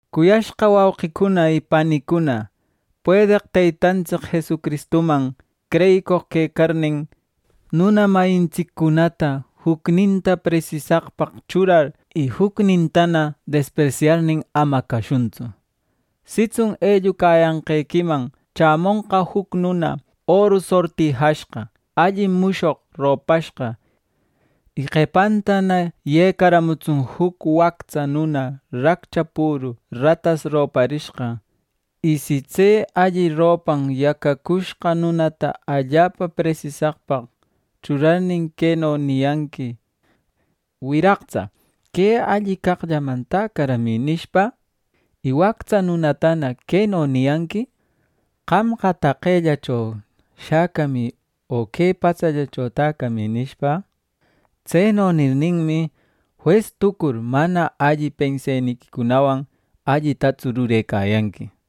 Cuyashqa wauqicuna y panicuna, puedeq Teytantsic Jesucristuman creyicoq quecarnin, nuna mayintsiccunata jucninta presisaqpaq churar y jucnintana despresyarnin ama cashuntsu. Sitsun ellucayanqequiman chämonqa juc nuna oru sortijashqa, alli mushoq ropashqa; y qepantana yecaramutsun juc wactsa nuna raccha püru ratas roparishqa. Y si tse alli ropan yacacushqa nunata allapa presisaqpaq churarnin, queno niyanqui: “Wiraqtsa, que alli caqllaman täcaramï” nishpa; y wactsa nunatana queno niyanqui: “Qamqa, taqellacho shäcamï, o que patsallacho täcamï” nishpa. Tseno nirninmi, jues tucur mana alli penseniquicunawan allitatsu rurecayanqui.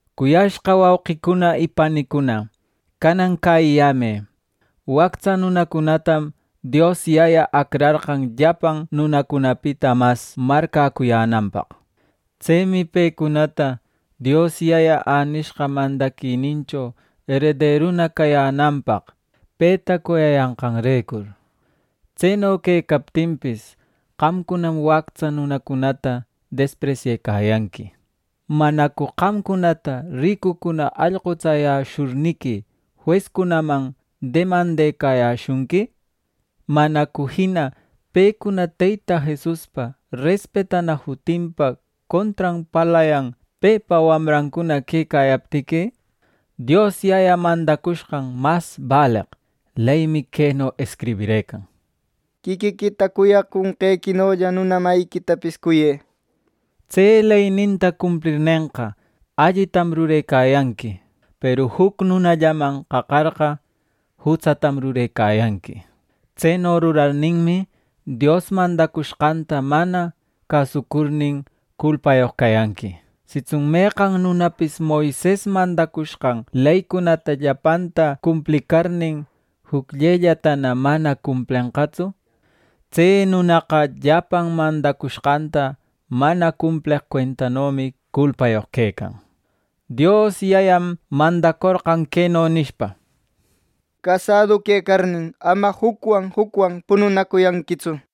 Cuyashqa wauqicuna y panicuna, canan cäyiyämë: Wactsa nunacunatam Dios Yaya acrarqan llapan nunacunapita mas marcäcuyänanpaq. Tsemi pecunata Dios Yaya änishqa mandaquinincho erederuna cayänanpaq, peta cuyayanqanrecur. Tseno quecaptinpis, qamcunam wactsa nunacunata despresyecayanqui. ¿Manacu qamcunata ricucuna allqutsayäshurniqui juescunaman demandecayäshunqui? ¿Manacu jina pecuna Teyta Jesuspa respetana jutinpa contran parlayan, pepa wamrancuna quecayaptiqui? Dios Yaya mandacushqan mas baleq leymi queno escribirëcan: “Quiquiquita cuyaconqequinolla nuna mayiquitapis cuyë” nishpa. Tse leyninta cumplirnenqa, allitam rurecayanqui; peru juc nunallaman qaqarqa, jutsatam rurecayanqui. Tseno rurarninmi, Dios mandacushqanta mana cäsucurnin, culpayoq cayanqui. Sitsun meqan nunapis Moises mandacushqan leycunata llapanta cumplicarnin, jucllellatana mana cumplenqatsu; tse nunaqa llapan mandacushqanta mana cumpleq cuentanomi. Culpayoq quecan. Dios Yayam mandacorqan queno nishpa: “Casadu quecarnin, ama jucwan jucwan pununacuyanquitsu” nishpa.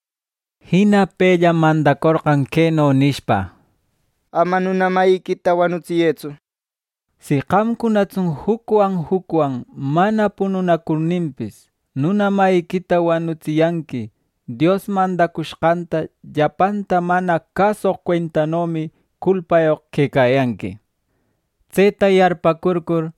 Jina pellam mandacorqan queno nishpa: “Ama nuna mayiquita wanutsiyëtsu”, nishpa. Si qamcunatsun jucwan jucwan mana pununacurninpis, nuna mayiquita wanutsiyanqui, Dios mandacushqanta llapanta mana cäsoq cuentanomi. Culpayoq quecayanqui. Tseta yarpäcurcur,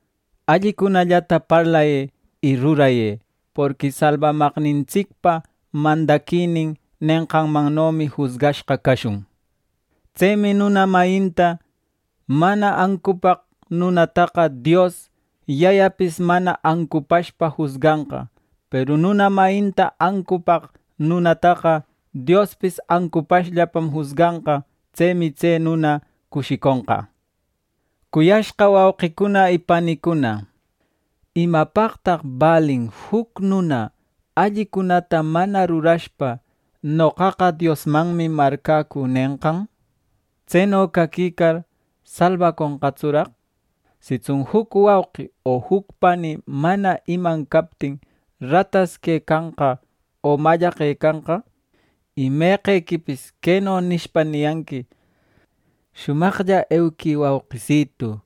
allicunallata parlayë y rurayë. Porqui salbamaqnintsicpa mandaquinin nenqanmannomi jusgashqa cashun. Tsemi nuna mayinta mana ancupaq nunataqa Dios Yayapis mana ancupashpa jusganqa; peru nuna mayinta ancupaq nunataqa Diospis ancupashllapam jusganqa. Tsemi tse nuna cushiconqa. Cuyashqa wauqicuna y panicuna, ¿imapaqtaq balin juc nuna, allicunata mana rurashpa, “Noqaqa Diosmanmi marcäcü” nenqan! Tseno caquicar, ¿salbaconqatsuraq! Sitsun juc wauqi o juc pani mana iman captin, ratas quecanqa o mallaqecanqa; y meqequipis queno nishpa niyanqui: “¡Shumaqlla euquï, wauqisitu!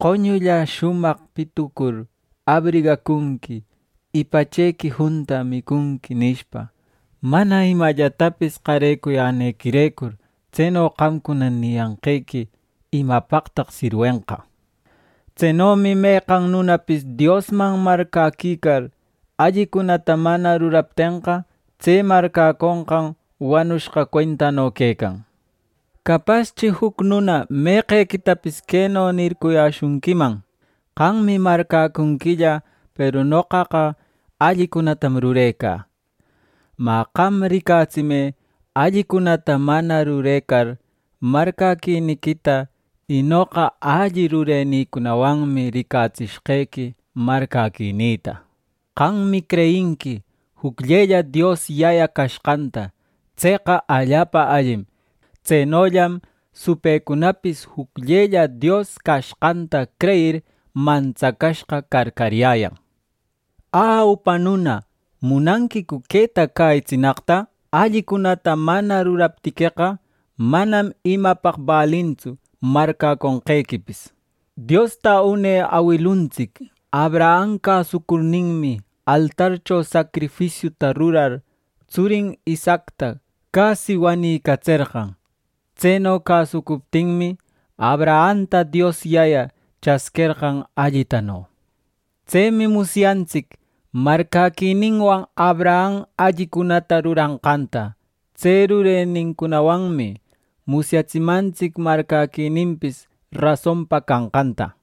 Qoñulla shumaq pitucur, abrigacunqui; y pachequi junta, micunqui” nishpa, mana imallatapis qarecuyänequirecur, tseno qamcuna niyanqequi, ¿imapaqtaq sirwenqa? Tsenomi meqan nunapis Diosman marcäquicar, allicunata mana ruraptenqa, tse marcäconqan wanushqa cuentano quecan. Capaschi juc nuna meqequitapis queno nircuyäshunquiman: “Qammi marcäcunquilla; peru noqaqa allicunatam rurecä.” Mä, qam ricatsimë allicunata mana rurecar marcäquiniquita; y noqa alli rurenicunawanmi ricatsishqequi marcäquinïta. Qammi creyinqui jucllella Dios Yaya cashqanta. Tseqa allapa allim. Tsenollam supëcunapis jucllella Dios cashqanta creyir mantsacashqa carcaryäyan. Ä, upa nuna, ¿munanquicu queta cäyitsinaqta? Allicunata mana ruraptiqueqa, manam imapaq balintsu marcäconqequipis. Diosta une awilituntsic Abraham cäsucurninmi, altarcho sacrifisiuta rurar, tsurin Isaacta casi wanïcatserqan. Tseno cäsucuptinmi, Abrahamta Dios Yaya chasquerqan allitano. Tsemi musyantsic marcäquininwan Abraham allicunata ruranqanta; tse rurenincunawanmi musyatsimantsic marcäquininpis rasonpa canqanta.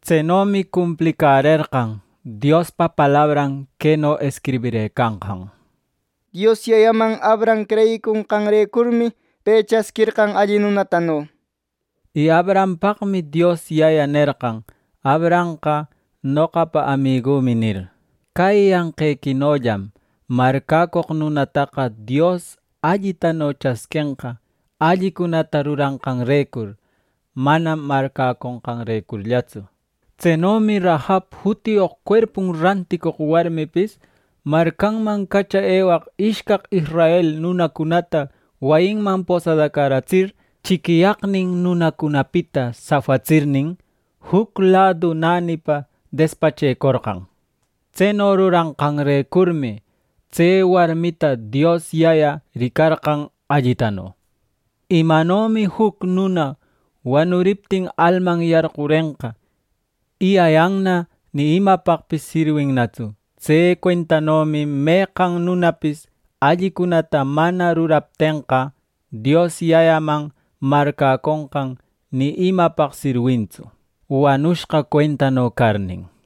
Tsenomi cumplicärerqan Diospa palabran queno escribirëcanqan: “Dios Yayaman Abraham creyiconqanrecurmi, pe chasquerqan alli nunatano.” Y Abrahampaqmi Dios Yaya nerqan: “Abrahamqa noqapa amigümi” nir. Cäyiyanqequinollam marcäcoq nunataqa Dios allitano chasquenqa allicunata ruranqanrecur, manam marcäconqanrecurllatsu. Tsenomi Rahab jutiyoq cuerpun ranticoq warmipis marcanman cacha ewaq ishcaq israel nunacunata wayinman posadacaratsir, chiquiyaqnin nunacunapita safatsirnin, juc ladu nänipa despachecorqan. Tseno ruranqanrecurmi, tse warmita Dios Yaya ricarqan allitano. Imanomi juc nuna wanuriptin alman yarqurenqa, y ayanna ni imapaqpis sirwinnatsu; tse cuentanomi meqan nunapis allicunata mana ruraptenqa, Dios Yayaman marcäconqan ni imapaq sirwintsu, wanushqa cuentano carnin.